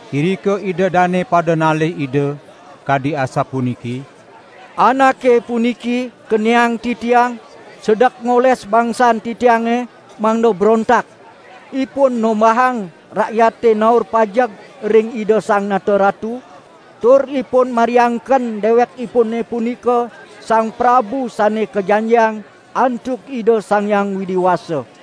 Irika ida dane pada nalih Ida, kadi asapuniki: "Anake puniki keniang titiang sedek ngoles bangsan titiange mangda brontak. Ipun nombahang rakyate naur pajeg ring Ida Sang Nata Ratu, tur Ipun mariangken Dewekipune punika Sang Prabu Sane Kajanjiang antuk Ida Sang Hyang Widi Wasa."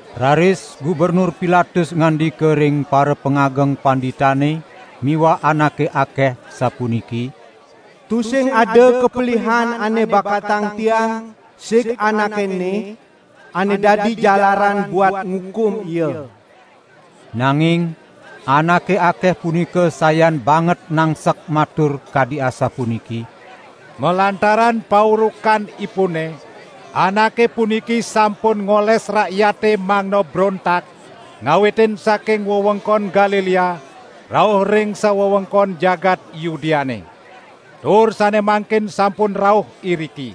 Raris Gubernur Pilatus ngandika ring parapangageng panditane miwah anake akeh, sapuniki: "Tusing ada kapelihan ane bakatang tiang sig Anake ene, ane dadi jalaran buat ngukum Ia." Nanging anake akeh punika sayan banget nangsek matur kadi asapuniki: "Malantaran paurukan Ipune, Anake puniki sampun ngoles rakyate mangda brontak, ngawitin saking wewengkon Galilea, rauh ring sawewengkon jagat Yudeane. Tur sane mangkin sampun rauh iriki."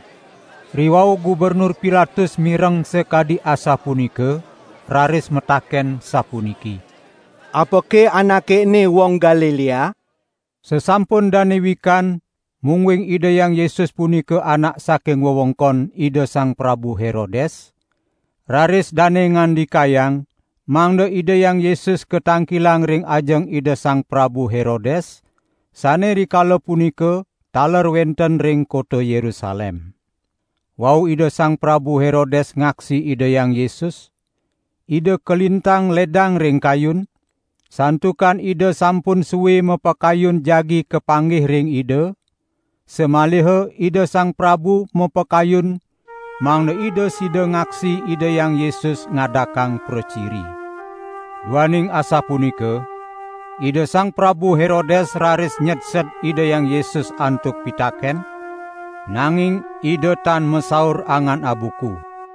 Riwau Gubernur Pilatus mireng sakadi asapunika, raris mataken sapuniki: "Apake Anake ene Wong Galilea?" Sasampun dane wikan mungguing Ida Hyang Yesus punika Anak saking wewengkon Ida Sang Prabu Herodes, raris dane ngandikayang mangda Ida Hyang Yesus katangkilang ring ajeng Ida Sang Prabu Herodes, sane rikala punika taler wenten ring kota Yerusalem. Wau Ida Sang Prabu Herodes ngaksi Ida Hyang Yesus, ida kalintang ledang ring kayun, santukan ida sampun sue mapakayun jagi kapanggih ring Ida, samaliha ida sang prabu mapakayun mangda ida sida ngaksi Ida Hyang Yesus ngadakang praciri. Duaning asapunika, Ida Sang Prabu Herodes raris nyedsed Ida Hyang Yesus antuk pitaken, nanging Ida tan masaur angan abuku.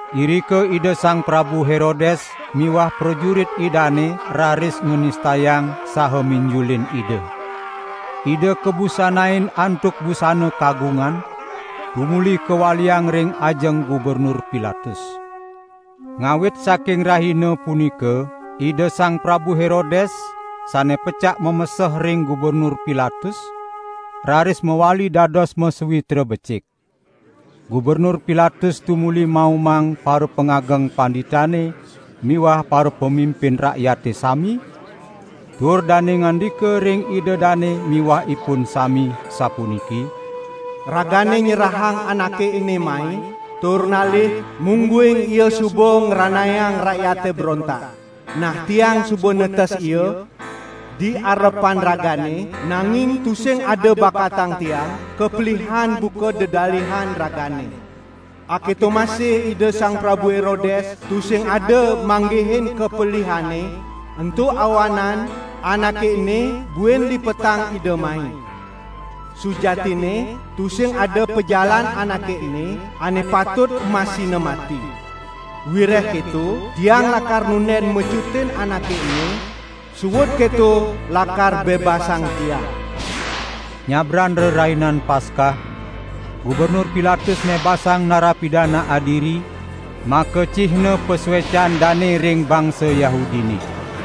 Irika Ida Sang Prabu Herodes miwah prajurit idane raris nganistayang saha minjulin Ida. Ida kabusanain antuk busana kagungan, tumuli kawaliang ring ajeng Gubernur Pilatus. Ngawit saking rahina punika Ida Sang Prabu Herodes, sane pecak mameseh ring Gubernur Pilatus, raris mawali dados masawitra becik. Gubernur Pilatus tumuli maumang parapangageng panditane miwah parapamimpin rakyate sami, tur dane ngandika ring ida dane miwah ipun sami, sapuniki: "Ragane nyerahang Anake ene mai, tur nalih mungguing Ia suba ngranayang rakyate brontak. Nah tiang suba netes Ia di arepan ragane, nanging tusing ada bakatang tiang kapelihan buka dedalihan ragane. Aketo masih Ida Sang Prabu Herodes tusing ada manggihin kapelihanNe, ento awanan Anake ene buin lipetang ida mai. Sujatinne tusing ada pajalan Anake ene ane patut emasina mati. Wireh keto tiang lakar nunden mecutin Anake ene, suud keto lakar bebasang tiang." ( Nyabran Rerainan Paskah, Gubernur Pilatus mebasang nara pidana adiri, makacihna pasuecan dane ring bangsa Yahudine.)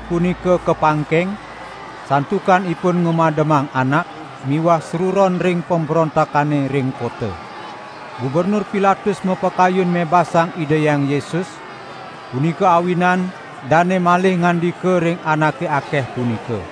punika kapangkeng, santukan ipun ngamademang anak miwah sruron ring pembrontakane ring kota.) Gubernur Pilatus mapakayun mebasang Ida Hyang Yesus, punika awinan dane malih ngandika ring anake akeh punika.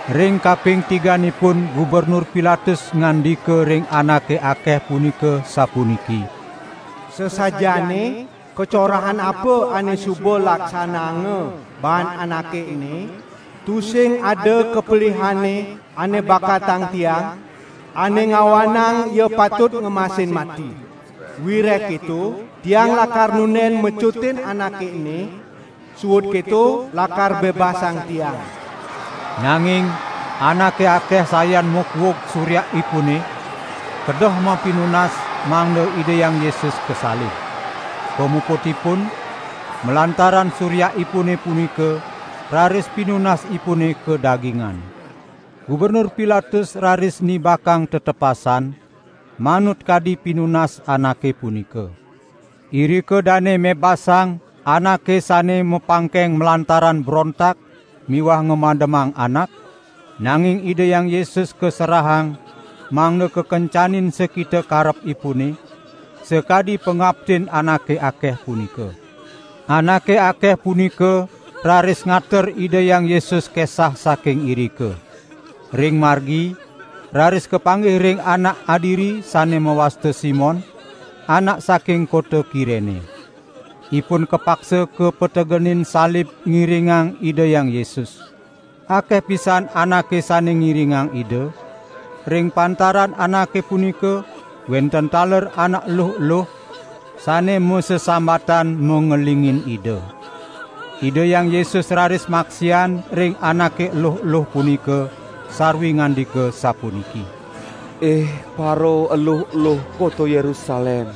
Ring kaping tiganipun Gubernur Pilatus ngandika ring anake akeh punika sapuniki: "Sasajaane kacorahan apa ane suba laksanaanga baan Anake ene? Tusing ada kapelihanNe ane bakatang tiang, ane ngawanang Ia patut ngemasin mati. Wireh keto, tiang lakar nunden mecutin Anake ene, suud keto lakar bebasang tiang." Nanging anake akeh sayan makuug suryakipune, kedeh mapinunas mangda Ida Hyang Yesus kasalib. Pamuputipun, malantaran suryakipune punika raris pinunasipune kadagingan. Gubernur Pilatus raris nibakang tetepasan, manut kadi pinunas anake punika. Irika dane mebasang anake sane mapangkeng malantaran brontak miwah ngamademang anak, nanging Ida Hyang Yesus kaserahang mangda kakencanin sakita karepipune, sakadi pangaptin anake akeh punika. Anake akeh punika raris ngater Ida Hyang Yesus kesah saking irika. Ring margi raris kapanggih ring anak adiri sane mawasta Simon, anak saking kota Kirene. Ipun kapaksa kapetegenin salib ngiringang Ida Hyang Yesus. Akeh pisan anake sane ngiringang Ida, ring pantaran anake punika wenten taler anak eluh-eluh, sane masesambatan mangelingin Ida. Ida Hyang Yesus raris maksian ring anake eluh-eluh punika sarwi ngandika sapuniki: "Ih paraeluh-eluh kota Yerusalem,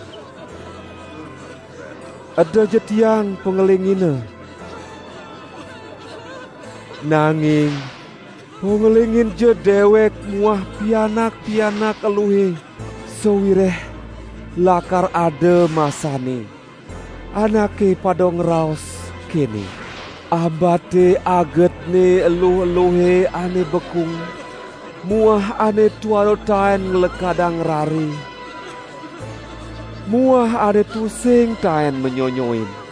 edaja Tiang pangelingina. Nanging pangelinginja dewek muah pianak-pianak eluhe. Sawireh lakar ada masanne, anake pada ngraos kene: 'Ambate agetne eluh-eluhe ane bekung muah ane tuara taen nglekadang rare muah ane tusing taen manyonyoin.'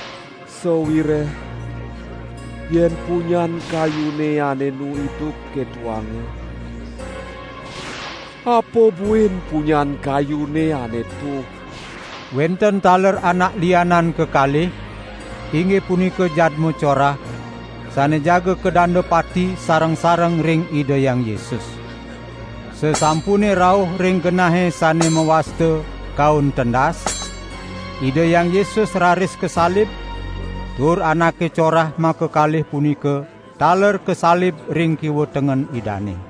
Sawireh yen punyan kayune ane enu idup ketoanga, ape buin punyan kayune ane tuh." Wenten taler anak lianan kekalih, inggih punika jadma corah, sane jaga kadanda pati sareng-sareng ring Ida Hyang Yesus. Sasampune rauh ring genahe sane mawasta: "Kaun Tendas", Ida Hyang Yesus raris kasalib, tur anake corah makakalih punika taler kasalib ring kiwa tengen Idane.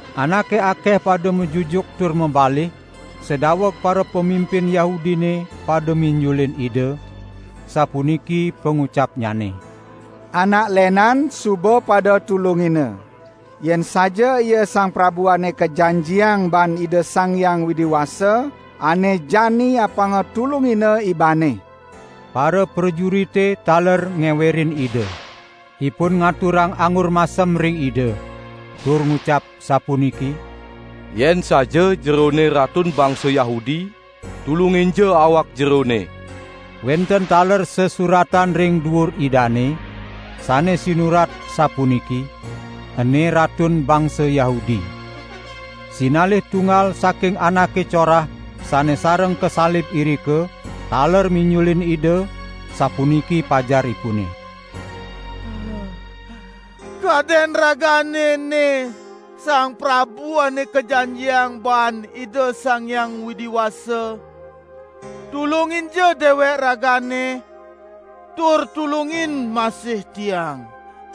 Anake akeh pada majujuk tur mabalih, sadaweg parapamimpin Yahudine pada minjulin Ida, sapuniki pangucapnyane: "Anak lenan suba pada tulungina. Yen saja Ia Sang Prabu Ane Kajanjiang baan Ida Sang Hyang Widi Wasa, ane jani apanga tulungina Ibanne!" Paraprajurite taler ngewerin Ida. Ipun ngaturang anggur masem ring Ida, tur ngucap sapuniki: "Yen saja Jerone Ratun bangsa Yahudi, tulunginja awak Jerone!" Wenten taler sesuratan ring duur Idane, sane sinurat sapuniki: "Ene Ratun bangsa Yahudi". Sinalih tunggal saking anake corah sane sareng kasalib irika taler minjulin Ida, sapuniki pajaripune: "Kaden Ragane ene Sang Prabu Ane Kajanjiang baan Ida Sang Hyang Widi Wasa? Tulunginja dewek Ragane, tur tulungin masih tiang!"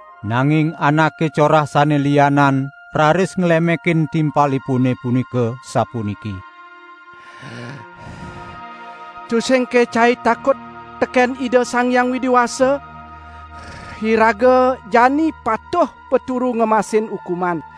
Nanging anake corah sane lianan raris nglemekin timpalipune punika sapuniki: "Tusingke cai takut teken Ida Sang Hyang Widi Wasa? Iraga jani patuh paturu ngemasin ukuman.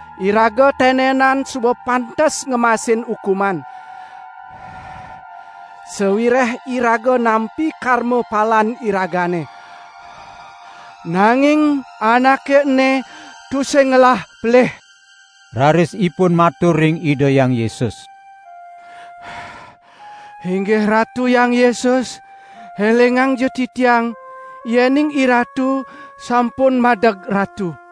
Iraga tenenan suba pantes ngemasin ukuman, sawireh iraga nampi karmapalan iragane. Nanging Anake ene tusing ngelah pelih." Raris ipun matur ring Ida Hyang Yesus: "Inggih Ratu Hyang Yesus, elingangja titiang yening IRatu sampun madeg Ratu."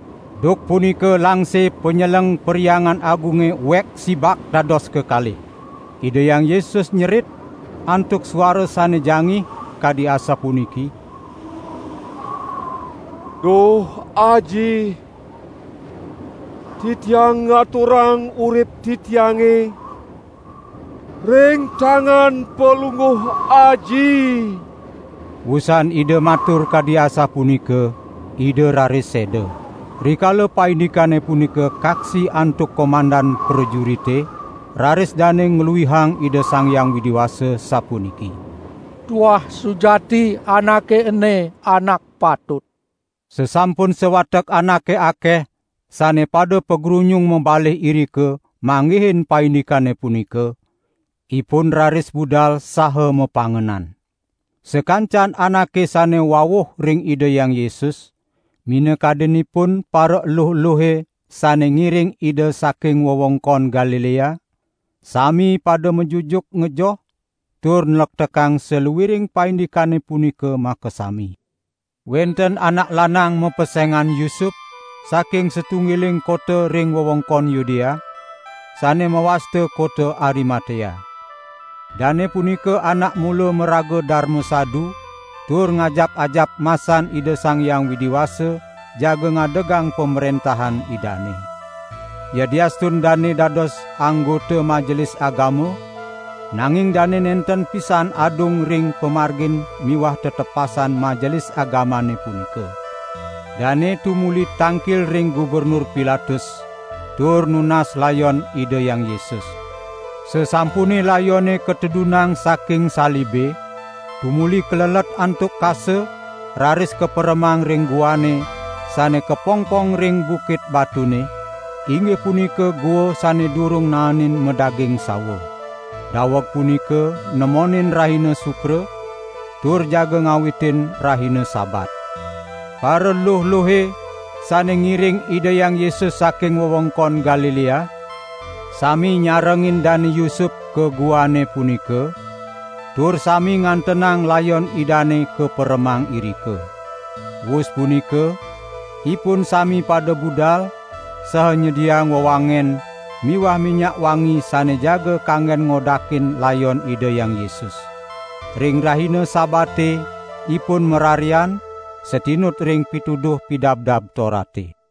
Duk punika langse panyeleng Perhyangan Agunge uek sibak dados kekalih. Ida Hyang Yesus nyerit antuk suara sane jangih, kadi asapuniki: "Duh Aji, Titiang ngaturang urip Titiange ring tangan Palungguh Aji." Wusan Ida matur kadi asapunika, Ida raris seda. Rikala paindikane punika kaksi antuk komandan prajurite, raris dane ngluihang Ida Sang Hyang Widi Wasa sapuniki: "Tuah sujati Anake ene anak patut!" Sasampun sawatek anake akeh sane pada pagrunyung mabalih irika, manggihin paindikane punika, ipun raris budal saha mapangenan. Sakancan anake sane wawuh ring Ida Hyang Yesus, minakadinipun paraeluh-eluhe sane ngiring Ida saking wewengkon Galilea, sami pada majujuk ngejoh tur nlektekang saluiring paindikane punika makasami. Wenten anak lanang mapesengan Yusup, saking satunggiling kota ring wewengkon Yudea, sane mawasta kota Arimatea. Dane punika anak mula maraga darma sadu tur ngajap-ajap masan Ida Sang Hyang Widi Wasa jaga ngadegang Pamrentahan Idane. Yadiastun dane dados anggota Majelis Agama, nanging dane nenten pisan adung ring pamargin miwah tetepasan Majelis Agamane punika. Dane tumuli tangkil ring Gubernur Pilatus tur nunas layon Ida Hyang Yesus. Sasampune layone katedunang saking salibe, tumuli kalelet antuk kasa, raris kaperemang ring guane sane kapongpong ring bukit batune, inggih punika gua sane durung naenin madaging sawa. Daweg punika nemonin rahina Sukra, tur jaga ngawitin rahina Sabat. Paraluh-luhe sane ngiring Ida Hyang Yesus saking wewengkon Galilea, sami nyarengin Dane Yusup ka guane punika, tur sami ngantenang layon Idane kaperemang irika. Wus punika ipun sami pada budal, saha nyediang wewangen miwah minyak wangi sane jaga kanggen ngodakin layon Ida Hyang Yesus. Ring rahina Sabate ipun mararian, satinut ring pituduh Pidabdab Torate.